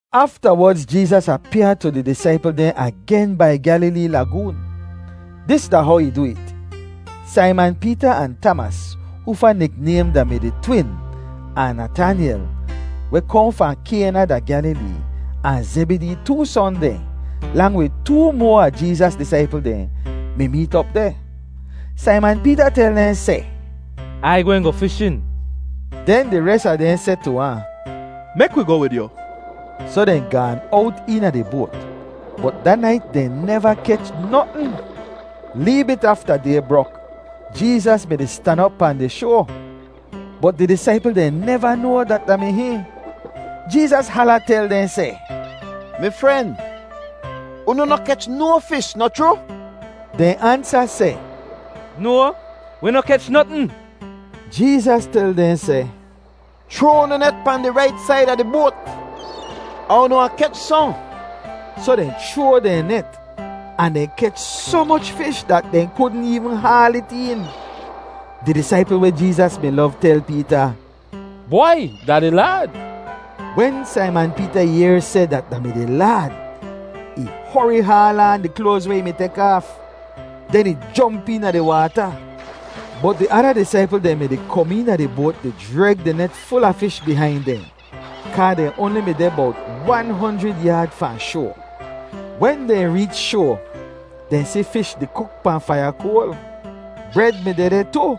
Aftawodz Jeezas apyaa tu di disaipl dehn agen bai Gyalilee Lagoon. Dis da how ih du it: Saiman Peeta ahn Tamas, hoofa niknaym da-mi di Twin, ahn Natanyel, weh kohn fahn Kayna da Gyalilee, ahn Zebidee too son dehn, lang wid too moa a Jeezas disaipl dehn, mi meet op deh. Saiman Peeta tel dehn seh, “Ai gwehn goh fishin.” Den di res a dehn seh tu ahn, “Mek wi goh wid yu.” Soh dehn gaan owt eena di boat, bot da nait dehn neva kech notn. Lee bit afta day brok, Jeezas mi-di stan op pahn di shoa, bot di disaipl dehn neva noa dat da mi hihn. Jeezas hala tel dehn seh, “Mi fren, unu noh kech no fish, noh chroo?” Dehn ansa seh, “No, wi noh kech notn.” Jeezas tel dehn seh, “Chroa unu net pahn di rait said a di boat, ahn unu wahn kech sohn.” Soh dehn chroa dehn net, ahn dehn kech soh moch fish dat dehn kudn eevn haal it een. Di disaipl weh Jeezas mi lov tel Peeta, “Bwai, da di Laad!” Wen Saiman Peeta yehr seh dat da mi di Laad, ih hori haal aan di kloaz weh ih mi tek aaf. Den ih jomp eena di waata. Bot di ada disaipl dehn mi-di kom eena di boat di jreg di net ful a fish bihain dehn, kaa dehn oanli mi deh bowt wahn honjrid yaad fahn shoa. Wen dehn reech shoa, dehn si fish di kuk pahn faiya koal. Bred mi dehdeh tu.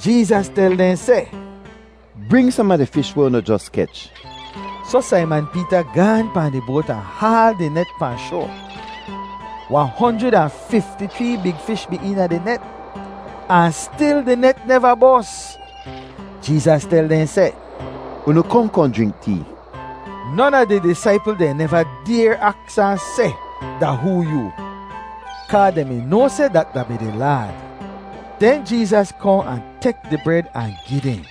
Jeezas tel dehn seh, “Bring som a di fish weh unu jos kech.” Soh Saiman Peeta gaahn pahn di boat ahn haal di net pahn shoa. Wahn honjrid ahn fifti-chree big fish mi eena di net, ahn stil di net neva bos. Jeezas tel dehn seh, “Unu kohn kohn jrink tee.” Non a di disaipl dehn neva dayr aks ahn seh, “Da hoo yoo?” kaa dehn mi noa seh dat da mi di Laad. Den Jeezas kohn ahn tek di bred ahn gi dehn;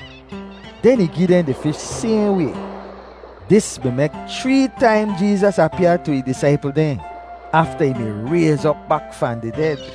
den ih gi dehn di fish sayhn way. Dis mi mek chree taim Jeezas apyaa tu ih disaipl dehn afta ih mi rayz op bak fahn di ded.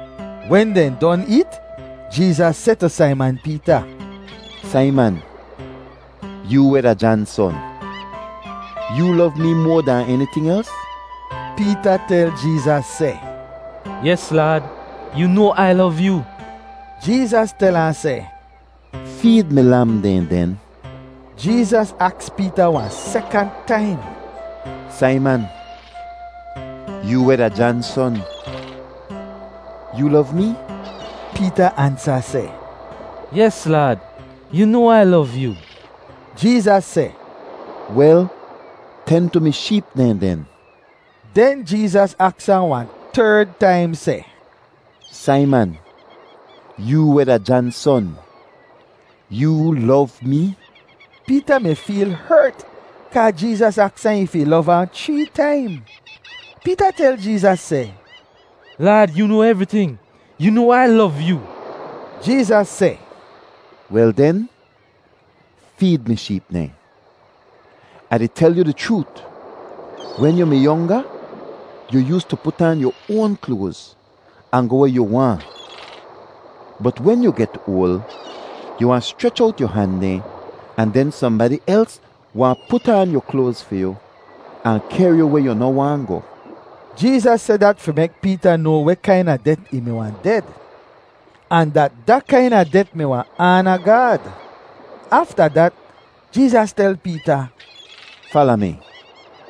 Wen dehn don eet, Jeezas seh tu Saiman Peeta, “Saiman, yoo weh da Jan son, yoo lov mee moa dahn eniting els?” Peeta tel Jeezas seh, “Yes Laad, yoo noa Ai lov yoo.” Jeezas tel ahn seh, “Feed mi lam dehn, den.” Jeezas aks Peeta wahn sekant taim, “Saiman, yoo weh da Jan son, yoo lov mee?” Peeta ansa seh, “Yes Laad, yoo noa Ai lov yoo.” Jeezas seh, “Wel, ten tu mi sheep dehn den.” Den Jeezas aks ahn wahn terd taim seh, “Saiman, yoo weh da Jan son, yoo lov mee?” Peeta mi feel hert kaa Jeezas aks ahn if ih lov ahn chree taim. Peeta tel Jeezas seh, “Laad, yoo noa evriting. Yoo noa Ai lov yoo.” Jeezas seh, “Wel den, feed mi sheep dehn. Ah di tel yu di chroot, wen yu mi yonga, yu yoostu put aan yu oan kloaz, ahn goh weh yu waahn. Bot wen yu get oal, yu wahn schrech owt yu han dehn ahn den sohnbadi els wahn put aan yu kloaz fi yu, ahn kehr yu weh yu noh waahn goh.” Jeezas seh dat fi mek Peeta noa weh kaina det ih mi wahn ded, ahn dat da kaina det mi wahn aana Gaad. Afta dat, Jeezas tel Peeta, “Fala mi.”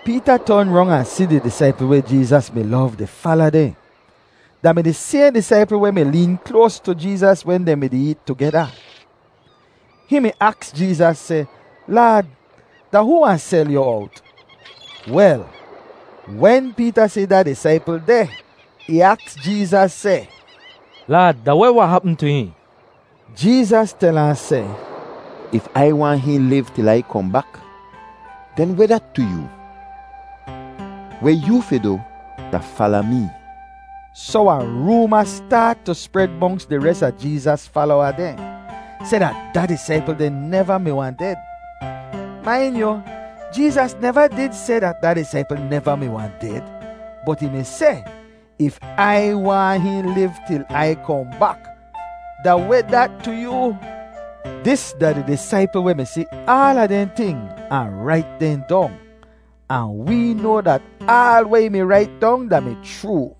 Peeta ton rong ahn si di disaipl weh Jeezas mi lov di fala dehn. Da mi di sayhn disaipl weh mi leen kloas tu Jeezas wen dehn mi-di eet tugeda. Hihn mi aks Jeezas seh, “Laad, da hoo wahn sel yu owt?” Wel, wen Peeta si da disaipl deh, ih aks Jeezas seh, “Laad, da weh wahn hapm tu hihn?” Jeezas tel ahn seh, “If Ai waahn hihn liv til Ai kohn bak, den weh dat tu yoo? Weh yoo fi du da fala mee!” Soh wahn rooma staat tu spred monks di res a Jeezas falowa dehn seh dat da disaipl deh neva mi wahn ded. Main yu, Jeezas neva did seh dat da disaipl neva mi wahn ded, bot ih mi seh, “If Ai waahn hihn liv til Ai kohn bak, da weh dat tu yoo?” Dis da di disaipl weh mi si aala dehn ting ahn rait dehn dong, ahn wee noa dat aal weh ih mi rait dong da-mi chroo.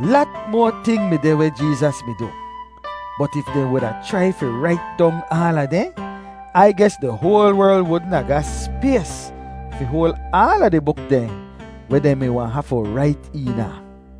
Lat moa ting mi deh weh Jeezas mi du, bot if dehn wuda chrai fi rait dong aala dehn, Ai ges di hoal werl wudn a ga spays fi hoal aala di buk dehn weh dehn mi wahn hafu rait eena.